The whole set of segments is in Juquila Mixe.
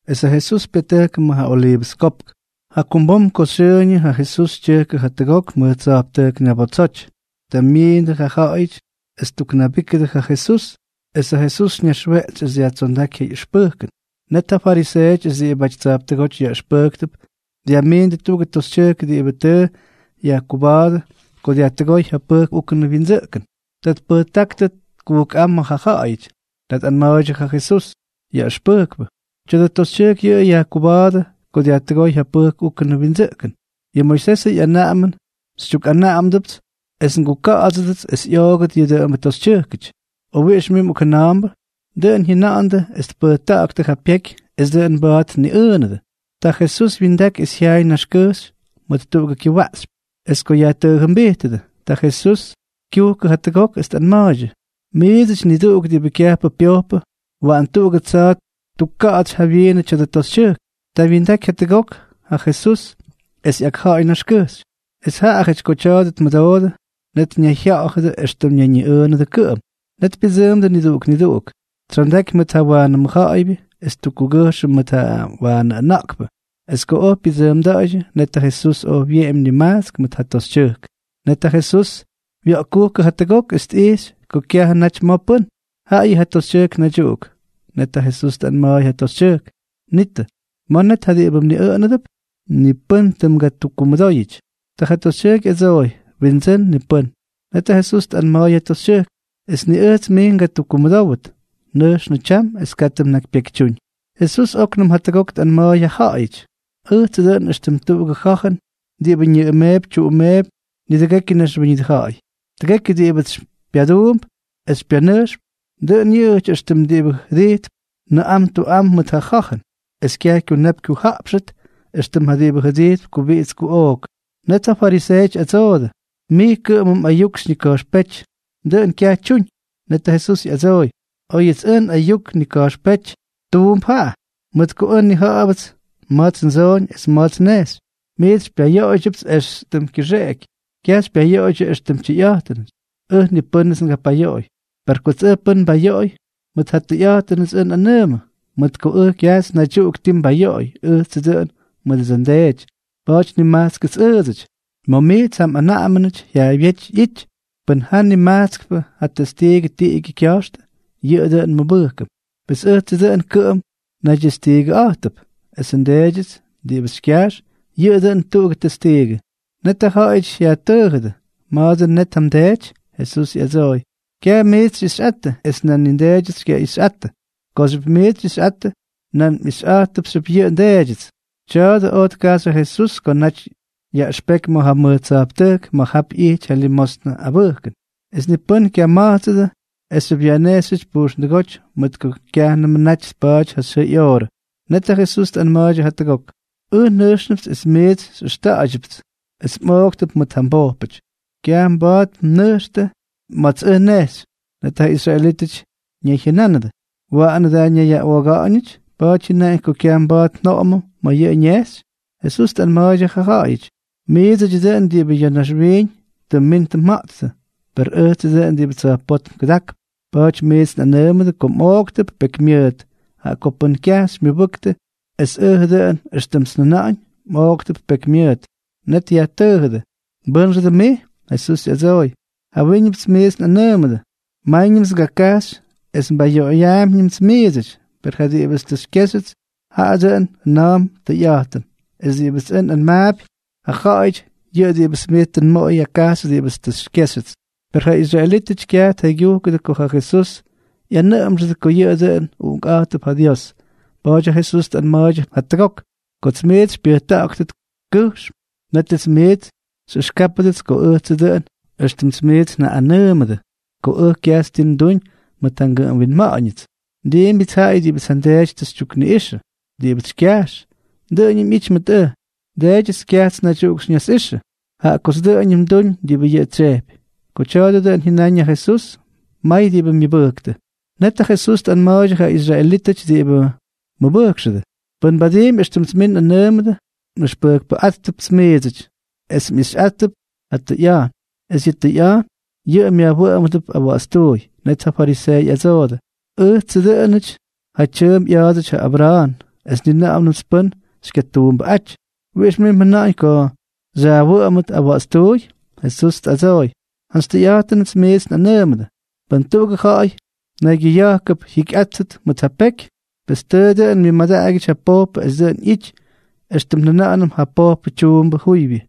Es ja Jesús pyatʉjkʉ ma̱ ja Oliivʉs Kopk. Jakumbom ko xyʉʉñʉ ja Jesús tyʉjkʉ jatʉgok mʉj tsa̱jptʉjk ñabotsoty. Ta myiindʉ ja ja̱ꞌa̱yʉty es ttuknabíkʉdʉ ja Jesús, es ja Jesús ñaxweꞌtsy es dyajtsondáky ja ꞌyʉxpʉjkʉn. Net ja fariseeʉty es diꞌibʉty tsa̱jptʉgóty yaꞌʉxpʉjktʉp dyajmiindʉ tuꞌugʉ toxytyʉjk diꞌibʉ tʉ yajkuba̱a̱dʉ ko dyajtʉgóy ja pʉjk úkʉnʉ wyindsʉꞌkʉn. Ta tpʉjtáktʉ kujkꞌám ma̱ ja ja̱ꞌa̱yʉty. Ta tꞌanma̱a̱ydyʉ ja Jesús: —Yaꞌʉxpʉjkpʉ, tya̱dʉ toxytyʉjk tʉ yajkuba̱a̱dʉ ko dyajtʉgóy ja pʉjk úkʉnʉ wyindsʉꞌkʉn. Yʉ Moisesʉ ꞌyanaꞌamʉn xytyukꞌanaꞌamdʉpts es nguka̱ꞌa̱dsʉdʉts es ꞌyoogʉt yʉ dʉꞌʉmbʉ toxytyʉjkʉty. ¿O wiꞌix mij mꞌokjʉna̱a̱mbʉ? Dʉꞌʉn jyʉnandʉ es tpʉjta̱ꞌa̱ktʉ ja pyeky es dʉꞌʉn mba̱a̱t tniꞌʉʉnʉdʉ. Ta Jesús wyindaky es jyaay naxkʉjxy mʉt tuꞌugʉ kyʉwaꞌxypy. Es ko yajtʉʉjʉmbijtʉdʉ, ta Jesús kyujkʉ jatʉgok es tꞌanma̱a̱ydyʉ: —Miidsʉty niduꞌuk diꞌibʉ kyajpʉ pyojpʉ, waꞌan tuꞌugʉ tsa̱a̱ ttukka̱ꞌa̱tsy jawyiinʉ tya̱dʉ toxytyʉjk. Ta wyindaky jatʉgok ja Jesús es ꞌyakja̱a̱y naxkʉjxy. Es jaꞌajʉty ko tya̱a̱dʉ tmʉdoodʉ, net ñayjya̱ꞌa̱dʉ éxtʉm ñayñiꞌʉʉnʉdʉ kʉꞌʉm. Net pyʉdsʉʉmdʉ niduꞌuk niduꞌuk, tsyondaky mʉt ja waanʉ mʉjja̱ꞌa̱ybyʉ es ttukkugʉjxʉ mʉt ja waanʉ ʉna̱ꞌkpʉ. Es ko oj pyʉdsʉʉmda̱ꞌa̱ydyʉ, net ja Jesús oj wyeꞌemy nimajtsk mʉt ja toxytyʉjk. Net ja Jesús wya̱ꞌkkujkʉ jatʉgok es tꞌijxy ko kyajʉ naty ma̱ pʉ́n, jaꞌayʉ ja toxytyʉjk naydyuꞌuk. Net ja Jesús tꞌanma̱a̱y ja toxytyʉjk: —Nitʉ, ¿ma̱ net ja diꞌibʉ mniꞌʉꞌʉnʉdʉp? ¿Ni pʉ́n tʉ mgatukkumʉdóyʉty? Ta ja toxytyʉjk ꞌyadsooy: —Windsʉ́n, ni pʉ́n. Net ja Jesús tꞌanma̱a̱y ja toxytyʉjk: —Es ni ʉjts mij ngatukkumʉdówʉt. Nʉjxnʉ tyam es katʉ mnakypyekytyúñ. Jesús óknʉm jatʉgok tꞌanma̱a̱y ja ja̱ꞌa̱yʉty: —Ʉjtsʉ dʉꞌʉn éxtʉm tuꞌugʉ ja̱jʉn diꞌibʉ ñʉꞌʉmeepy tyuꞌumeepy nidʉgekyʉ naxwíñʉdʉ ja̱ꞌa̱y. Tʉgekyʉ diꞌibʉts xypyaduump es xypyanʉjxp, dʉꞌʉn yʉꞌʉjʉty éxtʉm diꞌibʉ jʉdijttʉp nʉꞌam tuꞌam mʉt ja ja̱jʉn, es kyaj kyunap kyujaꞌpxʉt éxtʉm ja diꞌibʉ jʉdijtp kubiꞌits kuꞌook. Net ja fariseeʉty ꞌyadsoodʉ: —Mij kʉꞌʉmʉ mꞌayuk xyñika̱jxpéty, dʉꞌʉn kyaj tyuñ. Net ja Jesús ꞌyadsooy: —Oyʉts ʉj nꞌayuk nnika̱jxpéty, tuump jaꞌa, mʉt ko ʉj nnija̱ꞌa̱bʉts ma̱ts ndsooñ es ma̱ts nnejxy. Miits xypyayoꞌoydyʉpts éxtʉm kyʉxeꞌeky. Kyaj xypyayoꞌoydyʉ éxtʉm tyʉyꞌa̱jtʉnʉty. Ʉj ni pʉ́nʉts ngapayoꞌoy. Per kots ʉj pʉ́n nbayoꞌoy, mʉt ja tʉyꞌa̱jtʉnts ʉj nꞌanʉʉmʉ, mʉt ko ʉj kyajts naydyuꞌuk ti nbayoꞌoy, ʉjtsʉ dʉꞌʉn mʉdʉdsʉ nDeety. Pa̱a̱ty nimajtskʉts ʉʉdsʉty. Ma̱ miits ja mꞌanaꞌamʉnʉty ja̱a̱ybyéty ꞌyity: “Pʉn ja nimajtskpʉ ja testiigʉ tiꞌigyʉ kya̱jxtʉ, yʉꞌʉ dʉn nmʉbʉjkʉm.” Pes ʉjtsʉ dʉꞌʉn kʉꞌʉm nayñidestiigʉꞌa̱jtʉp, esʉ nDeedyʉts diꞌibʉts xykyajx, yʉꞌʉ dʉn jatuꞌugʉ testiigʉ. Net ja ja̱ꞌa̱yʉty yajtʉʉjʉdʉ: —¿Ma̱a̱ dʉn net ja mDeety? Jesús ꞌyadsooy: —Kyajts miits xyꞌixyꞌattʉ, es nan ni nDeedyʉts xykyaꞌixyꞌattʉ. Kooxyʉpts miits xyꞌixyꞌattʉ, nan mꞌixyꞌa̱jttʉpxyʉpts yʉ nDeedyʉts. Tya̱a̱dʉ oj tkajxy ja Jesús ko naty yaꞌʉxpeky ma̱ ja mʉj tsa̱jptʉjk ma̱ jap ꞌyity ja limosnʉ abʉjkʉn. Es ni pʉ́n kyama̱jtsʉdʉ esxyʉp yajnejxyʉty pujxndʉgóty, mʉt ko kyajnʉmʉ naty tpa̱a̱ty ja xyʉʉ ꞌyoorʉ. Net ja Jesús tꞌanma̱a̱ydyʉ jatʉgok: —Ʉj nʉjxnʉpts, es miits xyꞌʉxta̱ꞌa̱ydyʉpts, es mꞌooktʉp mʉt ja mbojpʉty. Kyaj mba̱a̱t mnʉjxtʉ ma̱ts ʉj nnejxy. Net ja israelítʉty ñayjyʉnánʉdʉ: —¿Waꞌanʉ da ñayyaꞌooga̱ꞌa̱ñʉty? ¿Pa̱a̱ty jyʉnaꞌañ ko kyaj mba̱a̱t njoꞌomʉm ma̱ yʉꞌʉ ñejxy? Jesús tꞌanma̱a̱ydyʉ ja ja̱ꞌa̱yʉty: —Miidsʉdyʉ dʉꞌʉn diꞌibʉ ya̱ naxwiiñ tʉ mmin tʉ mja̱ꞌttʉ, per ʉjtsʉ dʉꞌʉn diꞌibʉ tsa̱jpótm kʉdakp. Pa̱a̱ty miits nꞌanʉʉmʉdʉ ko mꞌooktʉp pekymyʉʉt, jaꞌa ko pʉn kyaj xymyʉbʉktʉ es ʉjʉ dʉꞌʉn éxtʉmts njʉna̱ꞌa̱ñ, mꞌooktʉp pekymyʉʉt. Net yajtʉʉjʉdʉ: —¿Mbʉ́nxʉ dʉn mij? Jesús ꞌyadsooy: —Jawyíñʉpts miits tʉ nꞌanʉʉmʉdʉ. Máyñʉmts ngakajxy es ngapayoꞌoyñʉmts miidsʉty. Per ja diꞌibʉts tʉ xykyéxyʉts, jaꞌa dʉꞌʉn jʉna̱a̱mp tʉyꞌa̱jtʉn, es diꞌibʉts ʉj nꞌanmaapy ja ja̱ꞌa̱yʉty, yʉꞌʉ diꞌibʉts tʉ nmʉdoy tkajxy ja diꞌibʉts tʉ xykyéxyʉts. Per ja israelítʉty kyaj tjaygyúkʉdʉ ko ja Jesús jyaꞌꞌanʉꞌʉmxʉdʉ ko yʉꞌʉ dʉꞌʉn Uꞌunkꞌa̱jtʉp ja Dios. Pa̱a̱ty ja Jesús tꞌanma̱a̱ydyʉ jatʉgok: —Kots miits xypyʉjta̱ꞌa̱ktʉt kʉjxm, nétʉts miits xyꞌʉxkáptʉdʉts ko ʉjtsʉ dʉꞌʉn éxtʉmts miits njaꞌꞌanʉʉmʉdʉ ko ʉj kyajts ti nduñ mʉt ja ngʉꞌʉm winma̱ꞌa̱ñʉts. Ndiimbyʉts jaꞌayʉ diꞌibʉts ja nDeedyʉts tʉ xytyukniꞌꞌixʉ. Diꞌibʉts xykyajx, dʉꞌʉñʉm ꞌyity mʉt ʉj. NDeedyʉts kyajts naydyuꞌuk xyñasꞌixʉ, jaꞌa kots dʉꞌʉñʉm nduñ diꞌibʉ yʉꞌʉ tsyejpy. Ko tya̱a̱dʉ dʉꞌʉn jyʉnáñ ja Jesús, may diꞌibʉ myʉbʉjktʉ. Net ja Jesús tꞌanma̱a̱ydyʉ ja israelítʉty diꞌibʉ mʉbʉjkxʉdʉ: —Pʉn mbadiimpy éxtʉmts miits nꞌanʉʉmʉdʉ, nꞌʉxpʉjkpʉꞌátʉpts miidsʉty, es mꞌixyꞌáttʉp ja tʉyꞌa̱jtʉn, es yʉ tʉyꞌa̱jtʉn yʉꞌʉ myajwʉꞌʉmʉdʉp awa̱ꞌa̱tstuuy. Net ja fariseeʉty ꞌyadsoodʉ: —Ʉjtsʉ dʉꞌʉnʉty ja tyʉʉmp ꞌya̱a̱dsʉty ja Abra̱a̱n, es ni na̱ꞌa̱nʉmts pʉ́n xykyatuumbʉꞌáty. ¿Wiꞌix mij mjʉna̱ꞌa̱ñ ko xyajwʉꞌʉmʉt awa̱ꞌa̱tstuuy? Jesús tꞌadsooy: —Jantsy tʉyꞌa̱jtʉnʉts miits nꞌanʉʉmʉdʉ, pʉn tuꞌugʉ ja̱ꞌa̱y naygyʉya̱jkʉp jyikyꞌátʉt mʉt ja pyeky, pes tʉʉ dʉꞌʉn myʉmadaꞌagyʉty ja pojpʉ es dʉꞌʉn ꞌyity éxtʉm njʉna̱ꞌa̱nʉm ja pojpʉ tyuumbʉ juybyʉ.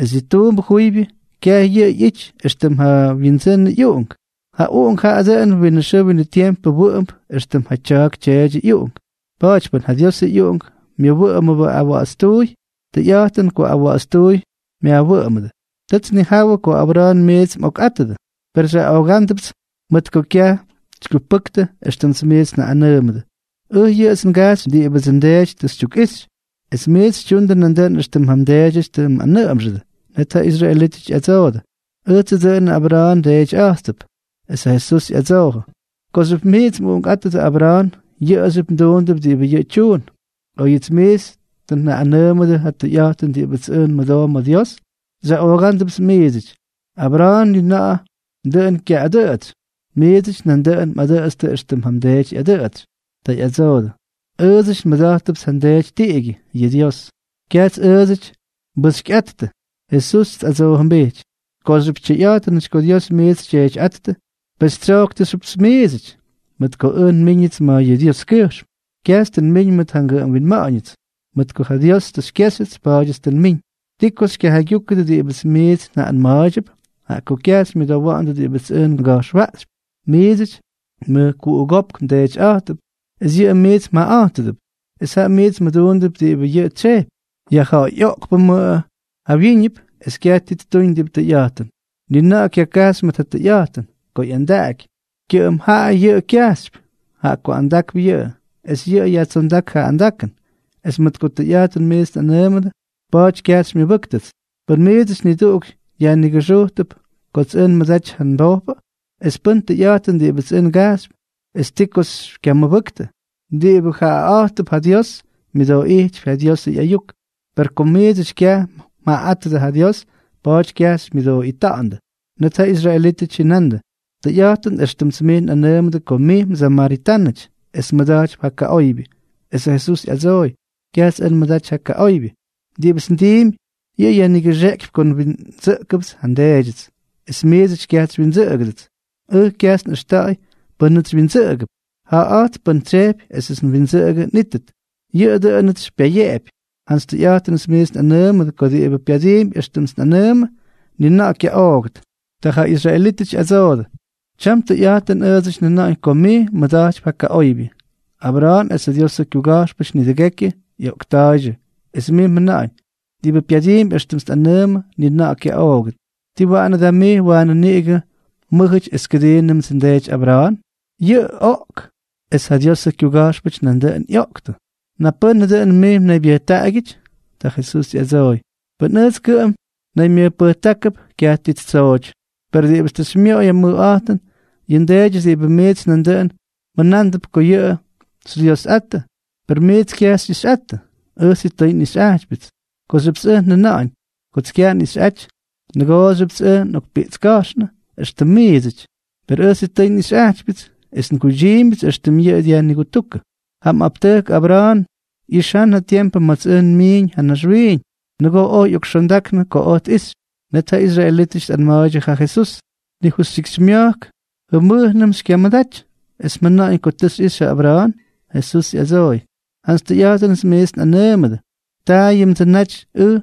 Es yʉ tuumbʉ juybyʉ, kyaj yʉꞌʉ ꞌyity éxtʉm ja windsʉnʉ ꞌyuꞌunk. Ja uꞌunk jaꞌa dʉꞌʉn winʉ xʉʉ winʉ tiempʉ wʉꞌʉmp éxtʉm ja tya̱a̱k tyeedyʉ ꞌyuꞌunk. Pa̱a̱ty pʉn ja Diosʉ ꞌyUꞌunk myajwʉꞌʉmʉdʉ awa̱ꞌa̱tstuuy, tʉyꞌa̱jtʉn ko awa̱ꞌa̱tstuuy myajwʉꞌʉmʉdʉ. Tʉts nnijawʉ ko Abra̱a̱n miits mꞌokꞌátʉdʉ. Per xyaꞌoogándʉpts mʉt ko kyaj xykyupʉktʉ éxtʉmts miits njaꞌꞌanʉʉmʉdʉ. Ʉj yʉꞌʉts ngajxypy diꞌibʉdsʉ nDeety tʉ xytyukꞌixy. Es miits xytyundʉ nandʉꞌʉn éxtʉm ja mdeedyʉty tʉ mꞌanʉꞌʉmxʉdʉ. Net ja israelítʉty ꞌyadsoodʉ: —Ʉjtsʉ dʉꞌʉn Abra̱a̱n ndeetyꞌa̱jtʉp. Es ja Jesús ꞌyadsoojʉ: —Kooxyʉp miits mꞌuꞌunkꞌátʉdʉ Abra̱a̱n, yʉꞌʉxyʉp mduundʉp diꞌibʉ yʉꞌʉ tyuun. Oyʉts miits tʉ njaꞌꞌanʉʉmʉdʉ ja tʉyꞌa̱jtʉn diꞌibʉts ʉj nmʉdoo ma̱ Dios, xyaꞌoogándʉpts miidsʉty. Abra̱a̱n ni na̱ꞌa̱ dʉꞌʉn kyaꞌꞌadʉtsy. Miidsʉty nandʉꞌʉn mꞌadʉꞌʉtstʉ éxtʉm ja mdeety ꞌyadʉꞌʉtsy. Ta ꞌyadsoodʉ: —Ʉʉdsʉty nmʉda̱jttʉpts ja nDeety tiꞌigyʉ, yʉꞌʉ Dios. Kyajts ʉʉdsʉty nbʉxykyꞌattʉ. Jesús tꞌadsoojʉmbijty: —Kooxyʉp tyʉyꞌa̱jtʉnʉty ko Dios miits xyTyeetyꞌáttʉ, pes xytsyojktʉpxyʉpts miidsʉty, mʉt ko ʉj nmíñʉts mʉt yʉ Dioskyʉjxm. Kyajts tʉ nmiñ mʉt ja ngʉꞌʉm winma̱ꞌa̱ñʉts. Mʉt ko ja Dios tʉ xykyéxyʉts, pa̱a̱dyʉts tʉ nmiñ. ’¿Ti ko xykyajaygyúkʉdʉ diꞌibʉts miits njaꞌꞌanma̱a̱ydyʉp? Jaꞌa ko kyaj xymyʉdowa̱ꞌa̱ndʉ diꞌibʉts ʉj nga̱jxwaꞌxypy. Miidsʉty mʉjkuꞌugópk mdeetyꞌa̱jttʉp es yʉꞌʉ miits mjaꞌaꞌa̱jtʉdʉp, es jaꞌa miits mduundʉp diꞌibʉ yʉꞌʉ tsyejpy. Yajja̱ꞌa̱yꞌoꞌkpʉmʉꞌʉ jawyíñʉp es kyaj ti ttuñ diꞌibʉ tʉyꞌa̱jtʉn. Ni na̱ꞌa̱ kyakajxy mʉt ja tʉyꞌa̱jtʉn. Ko ꞌyandaꞌaky, kyʉꞌʉm jaꞌa yʉꞌʉ kyajxypy, jaꞌa ko andakp yʉꞌʉ, es yʉꞌʉ yajtsondák ja andakʉn. Es mʉt ko tʉyꞌa̱jtʉn miits nꞌanʉʉmʉdʉ, pa̱a̱ty kyaj xymyʉbʉ́ktʉts. ¿Pʉ́n miidsʉty niduꞌuk dyajnigʉxʉꞌʉgʉt kots ʉj nmʉdaty ja nbojpʉ? Es pʉn tʉyꞌa̱jtʉn diꞌibʉts ʉj ngajxypy, ¿ti ko xykyamʉbʉktʉ? Diꞌibʉ jaꞌaꞌa̱jtʉp ja Dios, myʉdooꞌijtypy ja Diosʉ ꞌyayuk. Per kom miidsʉty kyaj mjaꞌaꞌátʉdʉ ja Dios, pa̱a̱ty kyaj xymyʉdooꞌita̱ꞌa̱ndʉ. Net ja israelítʉty jyʉnandʉ: —Tʉyꞌa̱jtʉn éxtʉmts mij nꞌanʉʉmʉdʉ ko mij msamaritánʉty es mmʉda̱jtypy ja kaꞌoybyʉ. Esʉ Jesús ꞌyadsooy: —Kyajts ʉj nmʉdaty ja kaꞌoybyʉ. Diꞌibʉts ndiimpy, yʉꞌʉ yajnigʉxeꞌkypy ko nwindsʉꞌkʉpts ja nDeedyʉts, es miits kyajts xywyindsʉꞌʉgʉdʉts. Ʉj kyajts nꞌʉxta̱ꞌa̱y pʉ́nʉts xywyindsʉꞌʉgʉp. Jaaꞌa̱jtp pʉ́n tsyejpy esʉts windsʉꞌʉgʉ nꞌítʉt, yʉꞌʉ dʉꞌʉnʉts xypyayeꞌepy. Jantsy tʉyꞌa̱jtʉnʉts miits nꞌanʉʉmʉdʉ ko diꞌibʉ pyadiimpy éxtʉmts nꞌanʉʉmʉ, ni na̱ꞌa̱ kyaꞌoogʉt. Ta ja israelítʉty ꞌyadsoodʉ: —Tyam tʉyꞌa̱jtʉn ʉʉdsʉty njʉna̱ꞌa̱ñ ko mij mmʉda̱jtypy ja kaꞌoybyʉ. Abra̱a̱n es ja Diosʉ kyuga̱jxpʉty nidʉgekyʉ ꞌyoꞌkta̱a̱ydyʉ, es mij mjʉna̱ꞌa̱ñ: “Diꞌibʉ pyadiimpy éxtʉmts nꞌanʉʉmʉ, ni na̱ꞌa̱ kyaꞌoogʉt.” ¿Tii waꞌanʉ da mij waanʉ niꞌigʉ mmʉ́jʉty es kʉdiinʉmdsʉ ndeety Abra̱a̱n? Yʉꞌʉ oꞌk, es ja Diosʉ kyuga̱jxpʉty nandʉꞌʉn ꞌyoꞌktʉ. ¿Napʉ́nʉ dʉꞌʉn mij mnaybyʉjtaꞌagyʉty? Ta Jesús ꞌyadsooy: —Pʉn ʉjts kʉꞌʉm naymyʉjpʉjtákʉp, kyaj ti ttsooty. Per diꞌibʉts tʉ xymyoꞌoy ja mʉjꞌa̱jtʉn, yʉꞌʉ nDeedyʉts diꞌibʉ miits nandʉꞌʉn mjʉnándʉp ko yʉꞌʉ xyDyiosꞌattʉ. Per miits kyaj xyꞌixyꞌattʉ. Ʉj sitʉy nꞌixyꞌajtypyʉts. Kooxyʉpts ʉj njʉna̱ꞌa̱ñ kots kyaj nꞌixyꞌaty, nʉgooxyʉpts ʉj nꞌokpiꞌtska̱jxnʉ éxtʉm miidsʉty. Per ʉj sitʉy nꞌixyꞌajtypyʉts, es nguydyiimbyʉts éxtʉm yʉꞌʉ dyajnigutúkʉ. ’Ja mꞌaptʉjk Abra̱a̱n ꞌyixán ja tiempʉ ma̱ts ʉj nmiiñ ya̱ naxwiiñ. Nʉgoo oj ꞌyokxondaknʉ ko oj tꞌixy. Net ja israelítʉty tꞌanma̱a̱ydyʉ ja Jesús: —Ni justyikxymya̱jk jʉmʉjnʉm xykyamʉdaty, ¿es mjʉna̱ꞌa̱ñ ko tʉ xyꞌixy ja Abra̱a̱n? Jesús ꞌyadsooy: —Jantsy tʉyꞌa̱jtʉnʉts miits nꞌanʉʉmʉdʉ, taayʉmdsʉ naty ʉj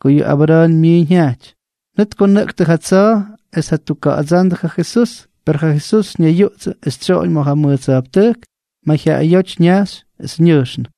ko yʉ Abra̱a̱n myiiñ jyajty. Net tkonʉꞌktʉ ja tsa̱a̱ es tjatukka̱ꞌa̱dsándʉ ja Jesús. Per ja Jesús ñayyuꞌtsʉ es tsyoꞌoñ ma̱ ja mʉj tsa̱jptʉjk, mayjyaꞌayóty ñajxy es ñʉjxnʉ.